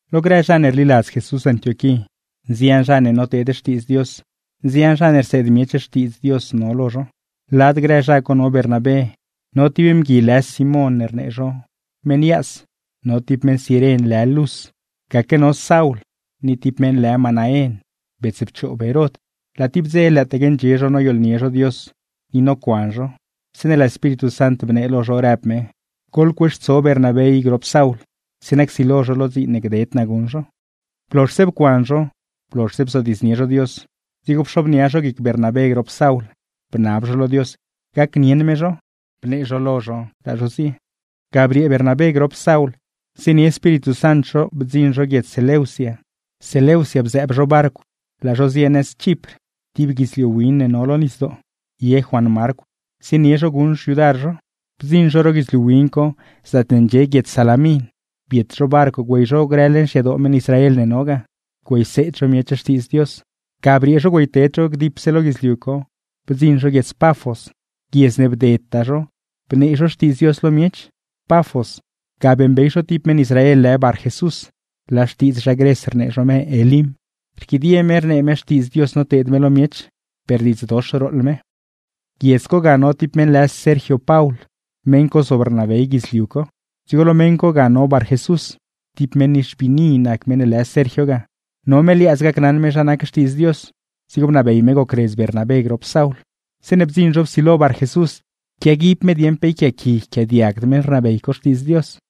Lo grë zha ne rliladz Jesús Antioquí, nzian zha ne noteed Xtiidz Dios, nzian zha ne rseed miech Xtiidz Dios no lo zho. Lad grë zha co no Bernabé, no ti mgui lë Simón ne rnee zho “Meṉ Yaas”, no ti meṉ Ciren lë Lus, gaque no Saul, ni ti meṉ lë Manaén, bets pchoob Herod. Laa ti dze lëëtaque ndxie zho noyooḻnie zho Dios ni nocuan zho, zeeṉe laa Espíritu Sant bnee lo zho, rëb me: ―Goḻcueextso Bernabé i grop Saul, zeeṉa csilo zho lo dziin ne gded naa guṉ zho. Blozhse pcuan zho, blozhse bzodiidznie zho Dios, dzigo pxobnia zho guic Bernabé grop Saul, bnab zho lo Dios gacnieṉ me zho; bnee zho lo zho, laa zho zie. Ga briee Bernabé grop Saul zienie Espíritu Sant zho bdziṉ zho guiedz Seleucia, Seleucia bzëëb zho barcw laa zho zie nëz Chipr (ti guidzliu win ne no lo nisdoo). Ye Juan Marcw zienie zho guṉ xyudar zho. Bdziṉ zho ro guidzliu win co zaatne ndxie guiedz Salamin, biet zho barcw güey zho grë leṉ xyadoo meṉ Israel ne no ga, güeyseed zho miech Xtiidz Dios. Ga briee zho güeyted zho dipse lo guidzliu co bdziṉ zho guiedz Pafos; guiedz ne bdedtaa zho bnee zho Xtiidz Dios lo miech. Pafos, ga beeṉbey zho ti meṉ Israel lë Barjesús (laa xtiidz zha Gres rnee zho me Elim). Rquidie me rnee me xtiidz Dios noteed me lo miech, per diidz dox rooḻ me. Guiedz co ga no ti meṉ lë Sergio Paul, meṉ co zob rnabey guidzliu co; dzigo lo meṉ co ga no Barjesús. Ti meṉ nixbiini nac meṉ ne lë Sergio ga, no me liaadz gacnaṉ me zha nac Xtiidz Dios; dzigo bnabey me gocredz Bernabé grop Saul. Zeeṉe bdziṉ zho psilo Barjesús quiaguib me dieṉ pe yquiaaqui yquiaadiagd meṉ rnabey co Xtiidz Dios.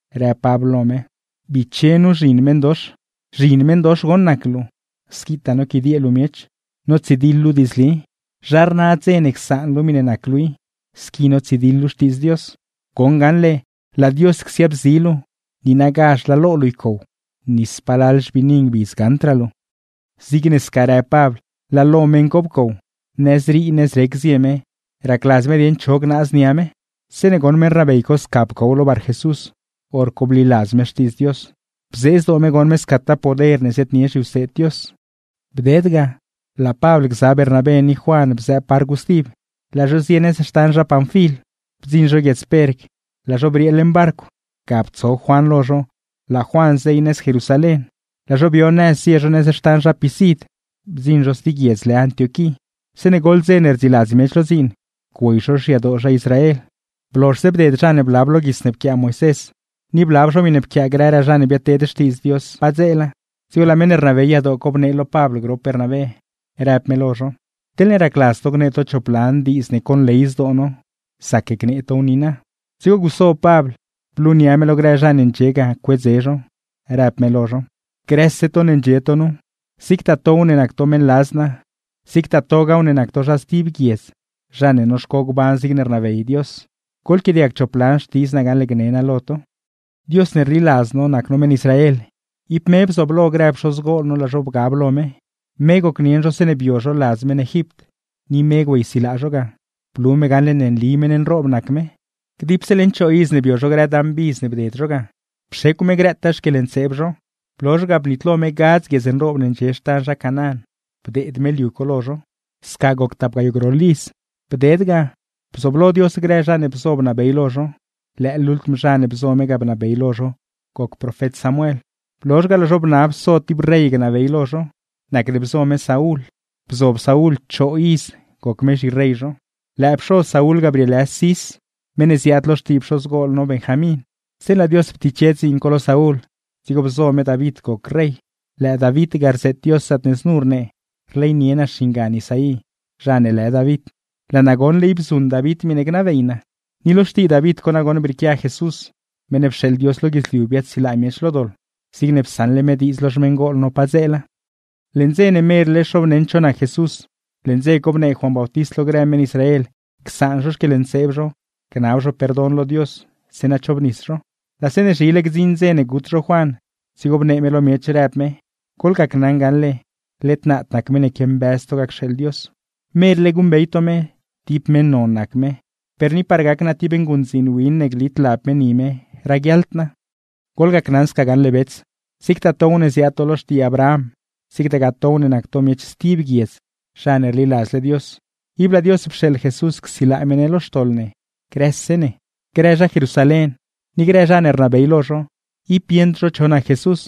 rëb Pabl lo me: ―¡Biche nu zhin meṉdox! Zhin meṉdox goṉ nac luu, squitaa noquidiee luu miech, notsidiḻ luu diidzli. ¿Zha rna dze ne csaan luu miṉe nac luu i, squi notsidiḻ luu Xtiidz Dios? Goṉ gaṉle, ¡laa Dios csiaabzi luu, niinagazh laa lo luu ycow, ni spalal xbiini ngbidz gaṉdraa luu! Zigne sca rëb Pabl laa lo meṉ co pcow, nëzrii nëzrec zie me racladz me dieṉ cho gnaaz nia me. Zeeṉe goṉ meṉ rnabey co sca pcow lo Barjesús, hor co bliladz me Xtiidz Dios, bzee zdoo me goṉ me scataa poder ne ziaadnie zhiwseed Dios. Bded ga, laa Pabl gza Bernabé ni Juan bzëëb barcw stib, laa zho zie nëz xtan zha Panfil. Bdziṉ zho guiedz Perg laa zho briee leṉ barcw, ga ptso Juan lo zho, laa Juan zey nëz Jerusalén; laa zho bio nëz zie zho nëz xtan zha Pisid, bdziṉ zho sti guiedz lë Antioquí. Zeeṉe goḻ dze ne rdziiladz miech lo dziin, güey zho xyadoo zha Israel. Blozhse bded zha ne blab lo guits ne pquiaa Moisés, ni blab zho miṉe pquiaa grëraa zha ne biadteed xtiidz Dios padzeela, dzigo laa meṉ ne rnabey yadoo co bnee lo Pabl grop Bernabé, rëb me lo zho: ―Teḻne racladz to gnee to chop lan xtiidz to, zac gnee tow niina. Dzigo guso Pabl, blunia me lo grë zha ne ndxie ga cuedze zho, rëb me lo zho: ―Grëse to ne ndxie to nu, zigtaa tow ne nac to meṉladz naa, zigtaa togaaw ne nac to zha stib guiedz zha ne noxco gban zigne rnabey Dios; goḻquiaadiag chop lan xtidz naa gaṉle gne naa lo to: ’Dios ne rliladz no nac no meṉ Israel, ib me bzooblo grë pxozgol no laa zho bgab lo me. Me gocnieṉ zho zeeṉe bio zho ladz meṉ Egipt, ni me güeysilaa zho ga, blu me gaṉle ne nli meṉ nroob nac me. Dipse leṉ choo iz ne bio zho grë dan bidz ne bded zho ga, pxecw me grëtaa xquieḻntseeb zho. Blozh ga, bnitlo me gadz guiedz nroob ne ndxie xtan zha Canaán, bdeed me liu co lo zho. Ni dipse leṉ tap gayoo groḻ iz, me bzooblo grë zha ne bzo bnabey lo zho; lëë lultm zha ne bzo me ga bnabey lo zho goc profet Samuel. Blozh ga, laa zho bnab so ti rey gnabey lo zho, nacne bzo me Saúl, bzob Saúl choo iz goc me zhirey zho. Lëë pxoz Saúl ga brieelë Cis, meṉ ne ziaad lo xtii pxozgol no Benjamín. Zeeṉe laa Dios ptiche dziin co lo Saúl, dzigo bzo me David goc rey. Lëë David ga rzeet Dios zaatne znu rnee: “Rleynie naa xingan Isaí zha ne lë David, laa naa goṉle ib zuṉ David miṉe gnabey naa.” Ni lo xtii David co nagoṉ brieequia Jesús, meṉ ne pxeeḻ Dios lo guidzliu biaadsilaa miech lo doḻ, zigne psaṉle me diidz lo xmeṉgol no padzeela. ’Leṉ dze ne merle xoobneṉ cho nac Jesús, leṉ dze co bnee Juan Bautist lo grë meṉ Israel: csaan zho xquieḻntseeb zho gnab zho perdon lo Dios, zeeṉa chobnis zho. Laa zeeṉe zhile gdziṉ dze ne gut zho Juan, dzigo bnee me lo miech rëb me: “Goḻgacnaṉ gaṉle, led naad nac meṉ ne quiambëz to ga cxeeḻ Dios. Merle guṉbey to me, ti meṉ non nac me, per ni par gac naa ti nguṉdziin win ne glit lab me ni me raguiaḻd naa.” ’Goḻgacnaṉ sca gaṉle bets: zigtaa tow ne ziaad to lo xtii Abraham, zigtagaa tow ne nac to miech stib guiedz zha ne rliladzle Dios, ib laa Dios pxeeḻ Jesús csilaa me ne lo xtoḻ ne grëse ne. Grë zha Jerusalén ni grë zha ne rnabey lo zho, ib bieṉd zho cho nac Jesús,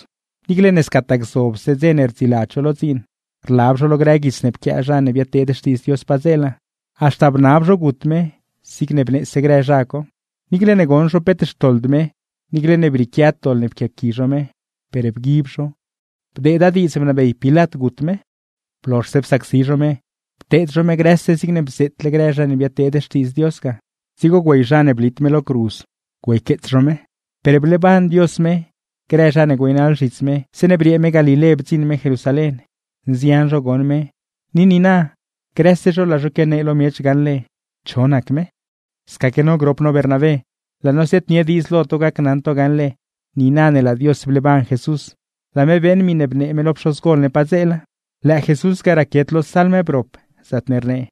niicle ne scataa gzobse dze ne rdziiladz zho lo dziin, rlab zho lo grë guits ne pquiaa zha ne biadteed xtiidz Dios padzeela; haxta bnab zho gut me zigne bneese grë zha co. Niicle ne goṉ zho peet xtoḻd me, niicle ne brieequiad doḻ ne pquiaqui zho me, per bguib zho bdeeda diidz bnabey Pilat gut me. ’Blozhse psacsi zho me, pteed zho me grëse zigne bzeetle grë zha ne biadteed xtiidz Dios ga, dzigo güey zha ne blit me lo cruz, güeyqueets zho me. Per bleeban Dios me. Grë zha ne güeynaḻ zhits me zeeṉe briee me Galilé bdziṉ me Jerusalén, nzian zho goṉ me; ni niina grëse zho laa zho quianee lo miech gaṉle cho nac me. ’Scaquegaa no grop no Bernabé, laa no ziaadnie diidz lo to gacnaṉ to gaṉle niina ne laa Dios bleeban Jesús, laa me beeṉ miṉe bnee me lo pxozgol ne padzeela. Lëë Jesús ga raquiet lo Salm brop, zaatne rnee: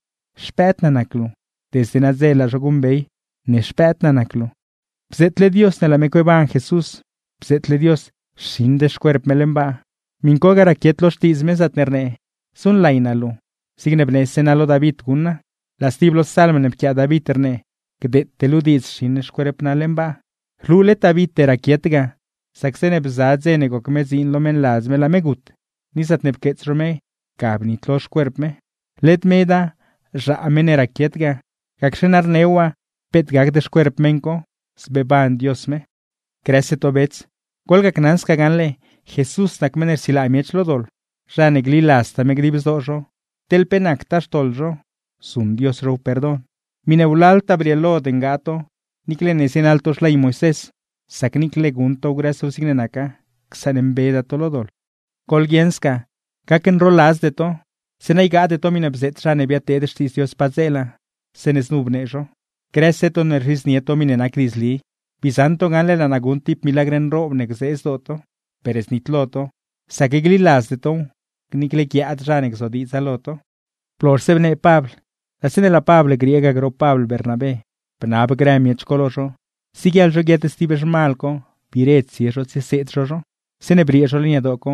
“Xpëëd naa nac luu. Desde nadze laa zho guṉbey ne Xpëëd naa nac luu.” Ni bzeetle Dios ne laa me cueeban Jesús, bzeetle Dios xiṉd xcuerp me leṉ baa; miṉ co ga raquiet lo Xtiidz me, zaatne rnee: “Zuṉlay naa luu, zigne bnese naa lo David guṉ naa.” Laa stib lo Salm ne pquiaa David rnee: “Gdeete luu diidz xiṉ xcuerp naa leṉ baa.” Rlu led Davite raquiet ga, sac zeeṉe bza dze ne goc me dziin lo meṉladz me laa me gut, ni zaatne pqueets zho me, ga bnitlo xcuerp me. Led meda, zhaa meṉ ne raquiet ga; gacxe na rneew waa peet gacd xcuerp meṉ co, zbeeban Dios me. ’¡Grëse to bets, goḻgacnaṉ sca gaṉle! ¡Jesús nac meṉ ne rsilaa miech lo doḻ! Zha ne gliladztaa me dib zdoo zho, teḻ pe nactaa grë xtoḻ zho, saṉmbe me zho. Miṉe wlaltaa brieelod ngaa to, niicle ne zienaḻ to xley Moisés; sac niicle guṉ tow grëse zigne naca, csaṉmbeda to lo doḻ. ’¡Goḻguieṉ sca gacnroladzde to! Zeeṉa ygaade to miṉe bzeet zha ne biadteed xtiidz Dios padzeela, zeeṉe znu bnee zho: Grëse to ne rzhidznie to miṉe nac diidzli, bii zaṉ to gaṉle laa naa guṉ ti milagr nroob ne gzee zdoo to; per znitlo to, sac gliladzde tow niicle guiaad zha ne gzodiidza lo to. Blozh bnee Pabl; laa zeeṉe laa Pabl griee ga grop Pabl Bernabé bnab grë miech co lo zho, siguieḻ zho guiet sti zhmal co biire tsie zho tsieseed zho zho. Zeeṉe briee zho leṉ yadoo co,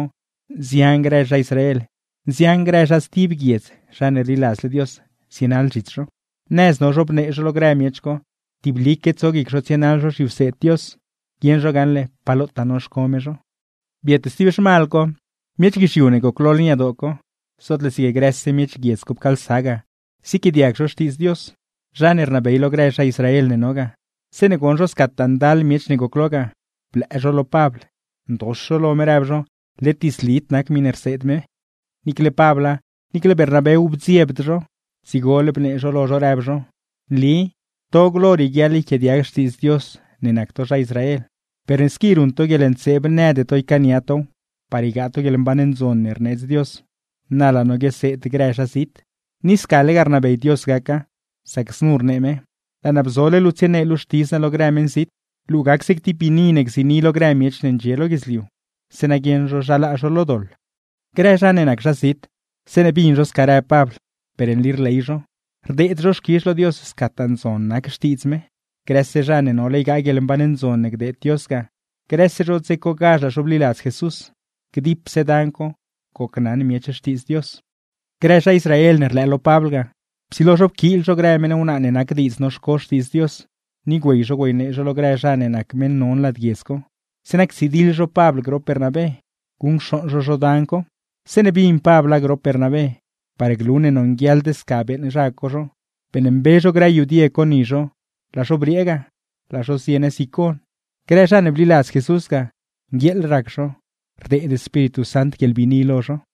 nzian grë zha Israel, nzian grë zha stib guiedz zha ne rliladzle Dios zienaḻ zhits zho. Nëz no zho bnee zho lo grë miech co tiblique tso guic zho tsienaḻ zho zhiwseed Dios, guieṉ zho gaṉle pa lotaa noxco me zho. Biet sti zhmal co, miech guizhiu ne goclo leṉ yadoo co, zootle zig grëse miech guiedz co pcaalsa ga ziequiaadiag zho Xtiidz Dios. Zha ne rnabey lo grë zha Israel ne no ga, zeeṉe goṉ zho scataa ndal miech ne goclo ga, blëë zho lo Pabl, ndox zho lo me, rëb zho led diidzlid nac miṉe rseed me. Niicle Pabla, niicle Bernabéw bdziebd zho, dzigole bnee zho lo zho rëb zho: ―Nli to glo rieguiaḻ yquiaadiag Xtiidz Dios ne nac to zha Israel. Per ne squi ruṉ to guieḻntseeb nëde to ycaania tow par ygaa to guieḻmban ndzon ne rneedz Dios; na laa no guioseed grë zhazit. Ni scalegaa rnabey Dios gaca, sac znu rnee me: Laa naa bzole luu tsienee luu Xtiidz naa lo grë meṉzit, luu gac zig ti biini ne gziini lo grë miech ne ndxie lo guidzliu; zeeṉa guieṉ zho zha laa zho lo doḻ. Grë zha ne nac zhazit, zeeṉe bin zho sca rëb Pabl, per nli rley zho, rdeed zho xquizh lo Dios scataa ndzon nac Xtiidz me. Grëse zha ne nole ygaa guieḻmban ndzon ne gdeed Dios ga, grëse zho dze cogazh laa zho bliladz Jesús. Dipse dan co, gocnaṉ miech Xtiidz Dios. Grë zha Israel ne rlëë lo Pabl ga, psilo zho pquiil zho grë meṉ wnaa ne nac diidz noxco Xtiidz Dios, ni güey zho güeynee zho lo grë zha ne nac meṉ non lad guiedz co; zeeṉa ctsidiḻ zho Pabl grop Bernabé, guṉcxooṉ zho zho dan co. Zeeṉe bin Pabla grop Bernabé, par glu ne nonguieḻd sca beeṉ zha co zho, beeṉmbe zho grë yudie co ni zho laa zho briee ga, laa zho zie nëz Icon. Grë zha ne bliladz Jesús ga, nguieeḻ rac zho, rdeed Espíritu Sant guieḻbiini lo zho.